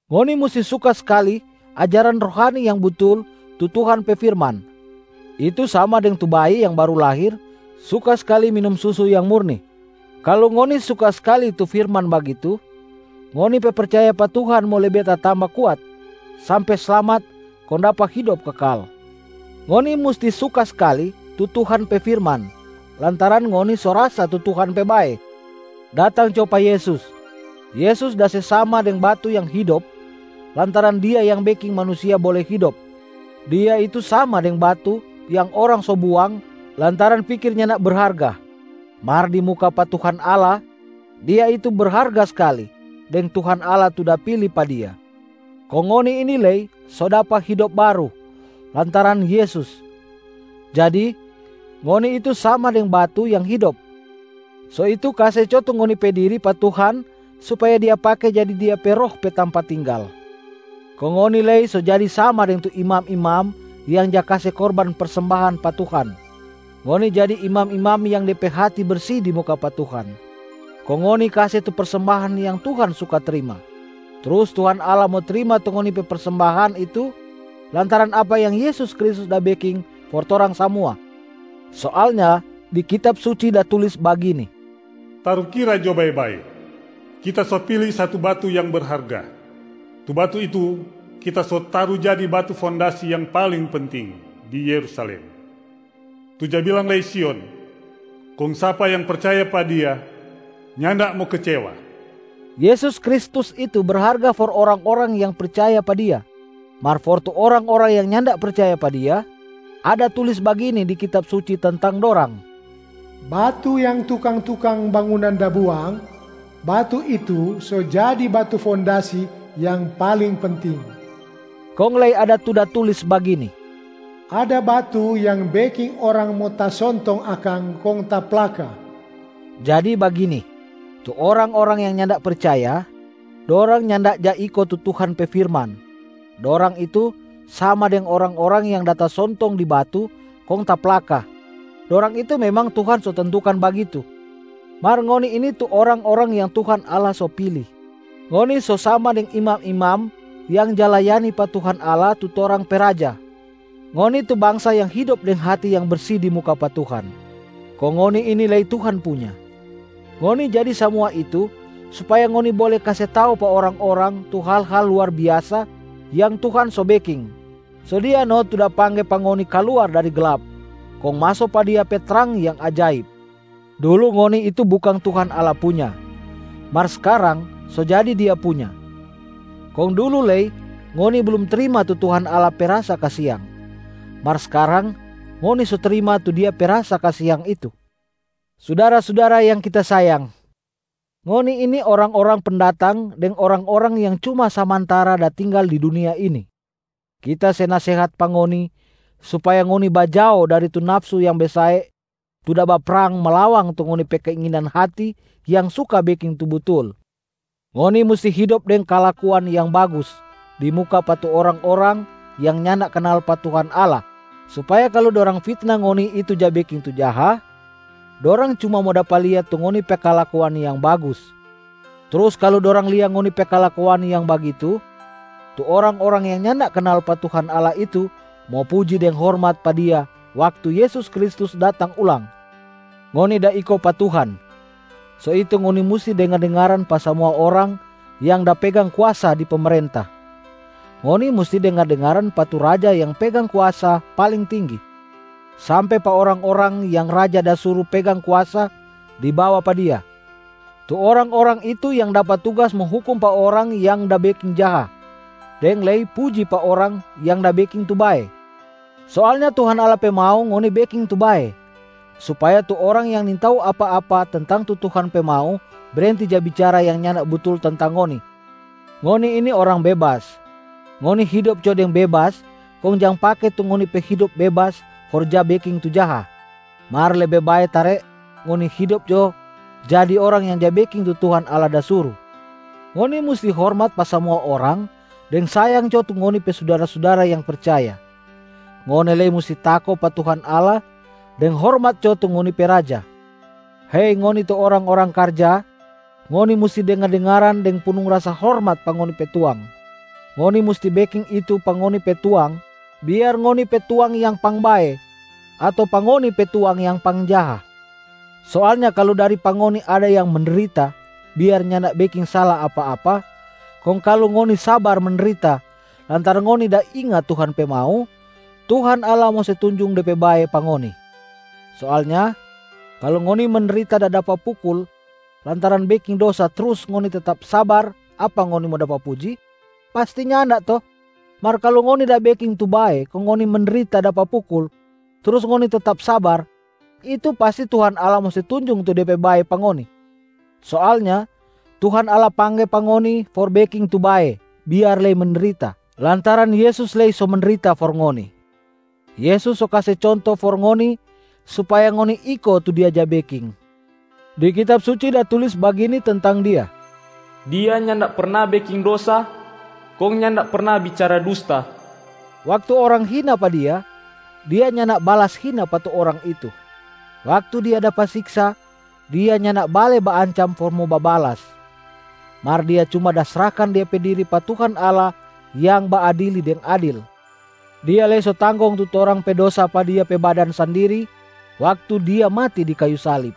Ngoni musti suka skali ajaran rohani yang butul tu Tuhan pe firman, itu sama deng tu bayi yang baru lahir suka skali minum susu yang murni. Kalu ngoni suka skali tu firman bagitu, ngoni pe percaya pa Tuhan mo lebe tatamba kuat sampe slamat kong dapa hidop kekal. Ngoni musti suka skali tu Tuhan pe firman lantaran ngoni so rasa tu Tuhan pe bae. Datang jo pa Yesus. Yesus da se sama deng batu yang hidop lantaran Dia yang beking manusia bole hidop. Dia itu sama deng batu yang orang so buang lantaran pikir nyanda berharga, mar di muka pa Tuhan Allah, Dia itu berharga skali deng Tuhan Allah tu da pili pa Dia. Kong ngoni ini lei so dapa hidop baru lantaran Yesus. Jadi, ngoni itu sama deng batu yang hidop, so itu kase jo tu ngoni pe diri pa Tuhan supaya Dia pake jadi Dia pe Roh pe tampa tinggal. Kong ngoni lei so jadi sama deng tu imam-imam yang ja kase korban persembahan pa Tuhan. Ngoni jadi imam-imam yang de pe hati bersi di muka pa Tuhan, kong ngoni kase tu persembahan yang Tuhan suka trima, trus Tuhan Allah mo trima tu ngoni pe persembahan itu lantaran apa yang Yesus Kristus da beking for torang samua. Soalnya di Kitab Suci da tulis bagini, “Tarukira jo bae-bae, Kita so pili satu batu yang berharga. Tu batu itu Kita so taru jadi batu fondasi yang paling penting di Yerusalem, tu ja bilang lei Sion. Kong sapa yang percaya pa Dia, nyanda mo kecewa.” Yesus Kristus itu berharga for orang-orang yang percaya pa Dia. Mar for tu orang-orang yang nyanda percaya pa Dia, ada tulis bagini di Kitab Suci tentang dorang, “Batu yang tukang-tukang bangunan da buang, batu itu so jadi batu fondasi yang paling penting.” Kong lei ada tu da tulis bagini, “Ada batu yang beking orang mo tasontong akang kong taplaka.” Jadi bagini: tu orang-orang yang nyanda percaya, dorang nyanda ja iko tu Tuhan pe firman, dorang itu sama deng orang-orang yang da tasontong di batu kong taplaka, dorang itu memang Tuhan so tentukan bagitu. Mar ngoni ini tu orang-orang yang Tuhan Allah so pili, ngoni so sama deng imam-imam yang ja layani pa Tuhan Allah tu torang pe Raja, ngoni tu bangsa yang hidop deng hati yang bersi di muka pa Tuhan, kong ngoni ini lei Tuhan punya. Ngoni jadi samua itu supaya ngoni bole kase tau pa orang-orang tu hal-hal luar biasa yang Tuhan so beking. So Dia no tu da pangge pa ngoni kaluar dari glap kong maso pa Dia pe trang yang ajaib. Dulu ngoni itu bukang Tuhan Allah punya, mar skarang so jadi Dia punya. Kong dulu lei ngoni blum trima tu Tuhan Allah pe rasa kasiang, mar skarang ngoni so trima tu Dia pe rasa kasiang itu. Sudara-sudara yang kita sayang, ngoni ini orang-orang pendatang deng orang-orang yang cuma samantara da tinggal di dunia ini. Kita se nasehat pa ngoni supaya ngoni bajao dari tu nafsu yang besae tu da baprang malawang tu ngoni pe keinginan hati yang suka beking tu butul. Ngoni musti hidop deng kalakuan yang bagus di muka pa tu orang-orang yang nyanda kanal pa Tuhan Allah supaya kalu dorang fitna ngoni itu ja beking tu jaha, dorang cuma mo dapa lia tu ngoni pe kalakuan yang bagus. Trus kalu dorang lia ngoni pe kalakuan yang bagitu, tu orang-orang yang nyanda kanal pa Tuhan Allah itu mo puji deng hormat pa Dia waktu Yesus Kristus datang ulang. Ngoni da iko pa Tuhan, so itu ngoni musti dengar-dengaran pa samua orang yang da pegang kuasa di pemerenta. Ngoni musti dengar-dengaran pa tu raja yang pegang kuasa paling tinggi, sampe pa orang-orang yang raja da suru pegang kuasa di bawa pa dia. Tu orang-orang itu yang dapa tugas mo hukum pa orang yang da beking jaha, deng lei puji pa orang yang da beking tu bae. Soalnya Tuhan Allah pe mau ngoni beking tu bae, supaya tu orang yang nintau apa-apa tentang tu Tuhan pe mau brenti ja bicara yang nyanda butul tentang ngoni. Ngoni ini orang bebas, ngoni hidop jo deng bebas kong jang pake tu ngoni pe hidop bebas for ja beking tu jaha. Mar lebe bae tare ngoni hidop jo jadi orang yang ja beking tu Tuhan Allah da suru. Ngoni musti hormat pa samua orang deng sayang jo tu ngoni pe sudara-sudara yang percaya. Ngoni lei musti tako pa Tuhan Allah deng hormat jo tu ngoni pe raja. Hei ngoni tu orang-orang karja, ngoni musti dengar-dengaran deng punung rasa hormat pa ngoni pe tuang. Ngoni musti beking itu pa ngoni pe tuang biar ngoni pe tuang yang pangbae, ato pa ngoni pe tuang yang pangjaha. Soalnya kalu dari pa ngoni ada yang mendrita biar nyanda beking sala apa-apa, kong kalu ngoni sabar mendrita lantaran ngoni da inga Tuhan pe mau, Tuhan Allah mo se tunjung De pe bae pa ngoni. Soalnya, kalu ngoni mendrita da dapa pukul lantaran beking dosa trus ngoni tetap sabar, apa ngoni mo dapa puji? Pasti nyanda to? Mar kalu ngoni da beking tu bae kong ngoni mendrita dapa pukul trus ngoni tetap sabar, itu pasti Tuhan Allah mo se tunjung tu Dia pe bae pa ngoni. Soalnya Tuhan Allah pangge pa ngoni for beking tu bae biar lei mendrita, lantaran Yesus lei so mendrita for ngoni. Yesus so kase conto for ngoni supaya ngoni iko tu Dia ja beking. Di Kitab Suci da tulis bagini tentang Dia, “Dia nyanda perna beking dosa, kong nyanda perna bicara dusta.” Waktu orang hina pa Dia, Dia nyanda balas hina pa tu orang itu. Waktu Dia dapa siksa, Dia nyanda bale baancam for mo babalas, mar Dia cuma da srahkan Dia pe diri pa Tuhan Allah yang baadili deng adil. Dia lei so tanggong tu torang pe dosa pa Dia pe badan sandiri waktu Dia mati di kayu salib.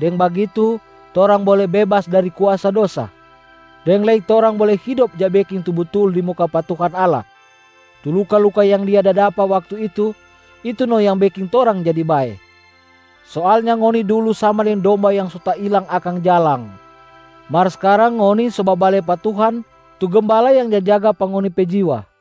Deng bagitu torang bole bebas dari kuasa dosa, deng lei torang bole hidop ja beking tu butul di muka pa Tuhan Allah. Tu luka-luka yang Dia da dapa waktu itu, itu no yang beking torang jadi bae. Soalnya ngoni dulu sama deng domba yang so tailang akang jalang, mar skarang ngoni so babale pa Tuhan tu Gembala yang ja jaga pa ngoni pe jiwa.